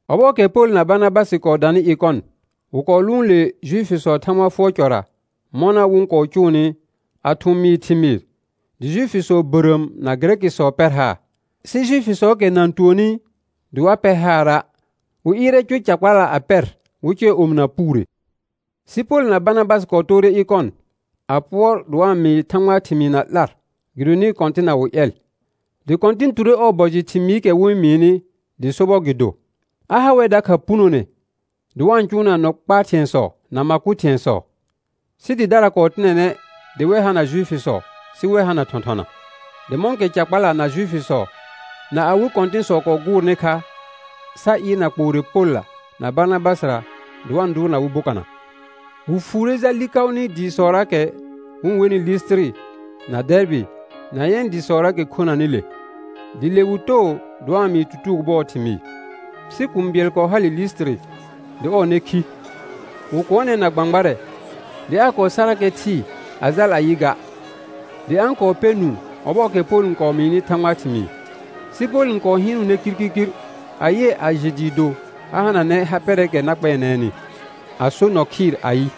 Ɔbɔɔkɛ Pol na Barnabasɩ kɔɔ danɩ Ɩkɔn, wɩ kɔɔ lʋʋn le Juifisɔɔ Thãgba fʋɔr cɔra mɔna wɩ-n kɔɔ cʋʋnɩ, a thʋ̃ mɩɩ thɩmɩɩr, dɩ Juifisɔ bərəəm na Gɩrɛkɩsɔ pɛr haar. Sɩ Juifisɔɔkɛ na-n tuonni dɩ wa pɛr haara', wɩ ɩɩrɛ cʋr ca kpala a pɛr wɩ cʋɛ omɩna puure. Sɩ Pol na Barnabasɩ kɔɔ toore Ɩkɔn a pʋɔr dɩ wa-n mɩɩ Thãgbaa thɩmɩɩ na 'lar gɩdonɩ Kɔ̃tɩnna wɩ ƴɛl; dɩ Kɔ̃tɩn ture ɔɔ bɔ jɩ thɩmɩɩkɛ wɩ-n mɩɩnɩ dɩ sobɔr gɩ do, a ha wɛr dakha punone dɩ wa-n cʋʋna nɔ kpaa thɩ̃ɛsɔ na ma kʋ thɩ̃ɛsɔ. Sɩ dɩdara kɔɔ tɩnɛnɛ dɩ wɛ hana Juifisɔ, sɩ wɛ hana thɔ̃thɔna. Dɩ mɔ̃kɛ ca kpala, na Juifisɔ, na awɩ kɔ̃tɩ̃sɔ kɔɔ gʋʋrnɩ kha sa ɩɩrna kpoore Polla na Barnabasɩra dɩ wa-n dʋʋrna wɩ bokana, wɩ fuure jal Likaʋnɩ dɩɩsɔraakɛ wɩ-n wenɩ Lisitiri na Dɛɛrbɩ na yɛ̃ dɩsɔraakɛ khonanɩ le. Dɩ le wɩ too dɩ wa-n mɩɩ tutugo bʋɔɔ thɩmɩɩ. Sɩ kũu bɩɛl kɔɔ hale Lisitiri dɩ ɔɔ nɛ khi; wɩ kʋɔnɛ na gbãgbarɛ dɩ aa kɔɔ sarakɛ thɩɩ a jal a yɩ ga. Dɩ a-n kɔɔ pɛ nũu ɔbɔɔkɛ Pol n kɔɔ mɩɩnɩ Thãgbaa thɩmɩɩ, sɩ Pol n hɩɩnʋʋnɛ kirkirkir a yɩɛ a jɩ dɩɩ do a hananɛ ha pɛrɛɛkɛ na kpɛɛnɛɛnɩ, a so nɔ khɩɩr ayɩ: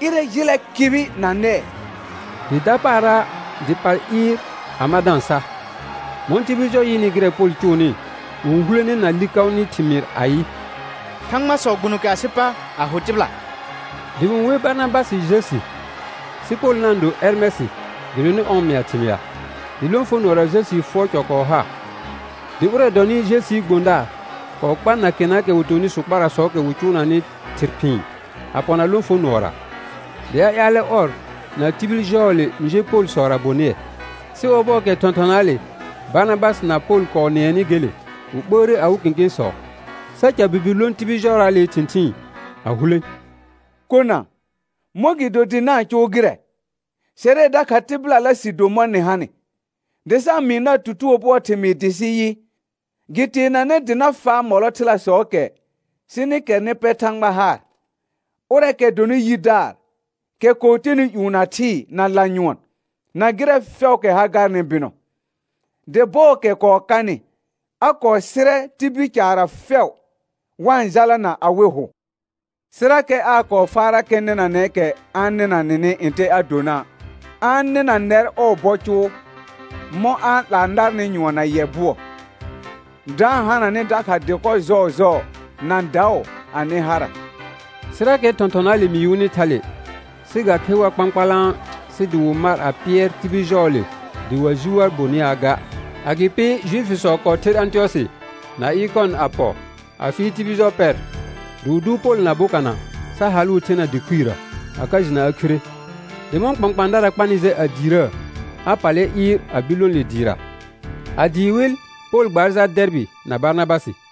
Ɩrɛ jɩlɛ kɩbɩ na nɛɛ; dɩ dapaara dɩ pal ɩɩr a ma da-n sa. Mɔ̃ tibil jɔ yɩnɩ gɩrɛ Pol cʋʋnɩ, wɩ-n hulene na Likaʋnɩ thɩmɩɩr ayɩ: Thãgbasɔ gbuno kɛ asɩ pa a ho tɩbɩla. Dɩ wɩ-n wer Barnabasɩ Jəsi, sɩ Pol na-n do Ɛrmɛsɩ gɩdonɩ ɔr n mɩa thɩmɩa. Dɩ lõfonʋɔra Jəsii fʋɔr cɔ kɔɔ ha; dɩ ʋrɛ dɔnɩ Jəsii gbõdaar kɔɔ kpar nakenaakɛ wɩ tonɩ sʋkparasɔɔkɛ wɩ cʋʋnanɩ thɩr phɩ̃ɩ a pɔna lõfonʋɔra, dɩ a ƴaalɛ ɔr, na tibil jɔɔle n je Polsɔra bonɩɛ. Sɩ ɔbɔɔkɛ thɔ̃thɔnaale Barnabasɩ na Pol kɔɔ nɩɛnɩ gele, wɩ ɓəəre awɩ kẽkẽsɔ sa ca birbir lõ tibil jɔraalee thɩ̃thɩɩn a hulẽ: Kona, mɔ̃gɩdo dɩ na-n cʋʋ gɩrɛ? Sɛrɛ dakha tɩbɩlala sɩ do mɔ̃ nɩ hanɩ, dɩ sa-n mɩɩ nar tutugo bʋɔɔ thɩmɩɩr dɩ sɩ yɩ, gɩ teenanɛ dɩ na faa mɔlɔ thɩlasɔɔkɛ sɩ nɩ kɛr nɩ pɛ Thãgba haar, ʋrɛɛkɛ dɔnɩ yidaar, kɛ kɔɔ tenɩ ƴũ, na thɩɩ, na lanyʋɔn, na gɩrɛ fɛʋʋkɛ ha garnɩ bɩnɔ. Dɩ bɔɔkɛ kɔɔ kanɩ, a kɔɔ sɩrɛ tibil caarra fɛʋ wa-n jalana awɩ hʋ, sɩrakɛ aa kɔɔ faarakɛ nɩnanɛɛkɛ a-n nɩnanɩ ntɛ a dona'; a-n nɩna nɛr ɔɔ bɔ cʋʋ mɔ̃ a-n 'laa narnɩ nyʋɔn na yɛ bʋɔ, da-n hana nɩ dakha dɩkɔ jɔɔjɔɔ na daʋ anɩ hara. Sɩrakɛ thɔ̃thɔnaale mɩɩ wɩnɩ thale, sɩ ga khe war kpãkpalã sɩ dɩ wɩ mar a pɩɛr tibil jɔɔle dɩ wa jɩ war bonɩaa ga. Agɩpɩ Juifisɔ kɔɔ ther Ãtɩyɔsɩ na Ɩkɔn a pɔ a fɩɩl tibil jɔ pɛr, dɩ wɩ dʋʋr Pol na bokana sa halʋʋ thena dɩ khuirə, a ka jɩna a khire. Dɩ mɔ̃ kpãkpãadara kpanɩ jɛ a diirəə, a pallɛ ɩɩr a bir lõ le dɩɩra. A dɩɩ wɩl Pol gbaar jal Dɛɛrbɩ na Barnabasɩ.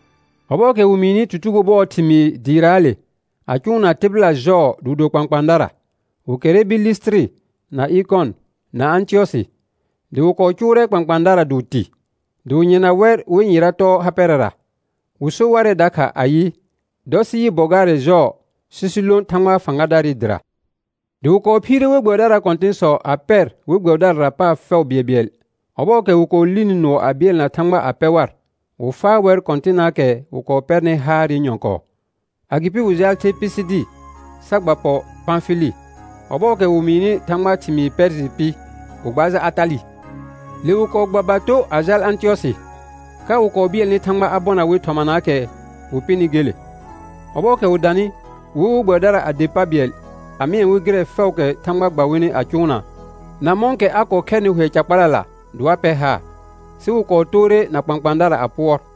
Ɔbɔɔkɛ wɩ mɩɩnɩ tutugo bʋɔɔ thɩmɩɩ dɩɩraale a cʋʋna tɩbɩla jɔɔ dɩ wɩ do kpãkpãadara, wɩ kɛrrɛ bir Lisitiri, na Ɩkɔn, na Ãtɩyɔsɩ; dɩ wɩ kɔɔ cʋʋrɛ kpãkpãadara dɩ wɩ tɩ, dɩ wɩ yɩrna wɛr wɩ yɩra tɔɔ ha pɛrɛra, wɩ so warɛ dakha ayɩ, dɔ sɩ yɩ bɔ gaarɛ jɔɔ sɩ sɩ lõ Thãgba fãgadaarɩ dɩra. Dɩ wɩ kɔɔ phiire we gbɛbɩdaraa kɔ̃tɩ̃sɔ a pɛ we gbɛbɩdarara paar fɛʋ bɩɛlbɩɛl; ɔbɔɔkɛ wɩ kɔɔ lini nʋɔ a bɩɛlna Thãgba a pɛ war, wɩ faa wɛr Kɔ̃tɩnnaakɛ wɩ kɔɔ pɛrnɩ haarɩ nyɔ̃kɔɔ. Agɩpɩ wɩ jaal the Pisidi sa gba pɔ Pãfɩlɩ. Ɔbɔɔkɛ wɩ mɩɩnɩ Thãgbaa thɩmɩɩ Pɛɛrjɩ pɩ, wɩ gbaar jal Atalɩ. Le wɩ kɔɔ gba bato a jal Ãtɩyɔsɩ, ka wɩ kɔɔ bɩɛlnɩ Thãgba a bɔna wɩ thɔmanaakɛ wɩ pɩnɩ gele. Ɔbɔɔkɛ wɩ danɩ, wɩ wer we gbɛbɩdara a der pa bɩɛl a mɩɛ wɩ gɩrɛ fɛʋʋkɛ Thãgba gba wɩnɩ a cʋʋna, na mɔ̃kɛ a kɔɔ khɛrnɩ hʋɛ ca kpalala dɩ wa pɛr haar. Sɩ wɩ kɔɔ toore na kpãkpãadara a pʋɔr.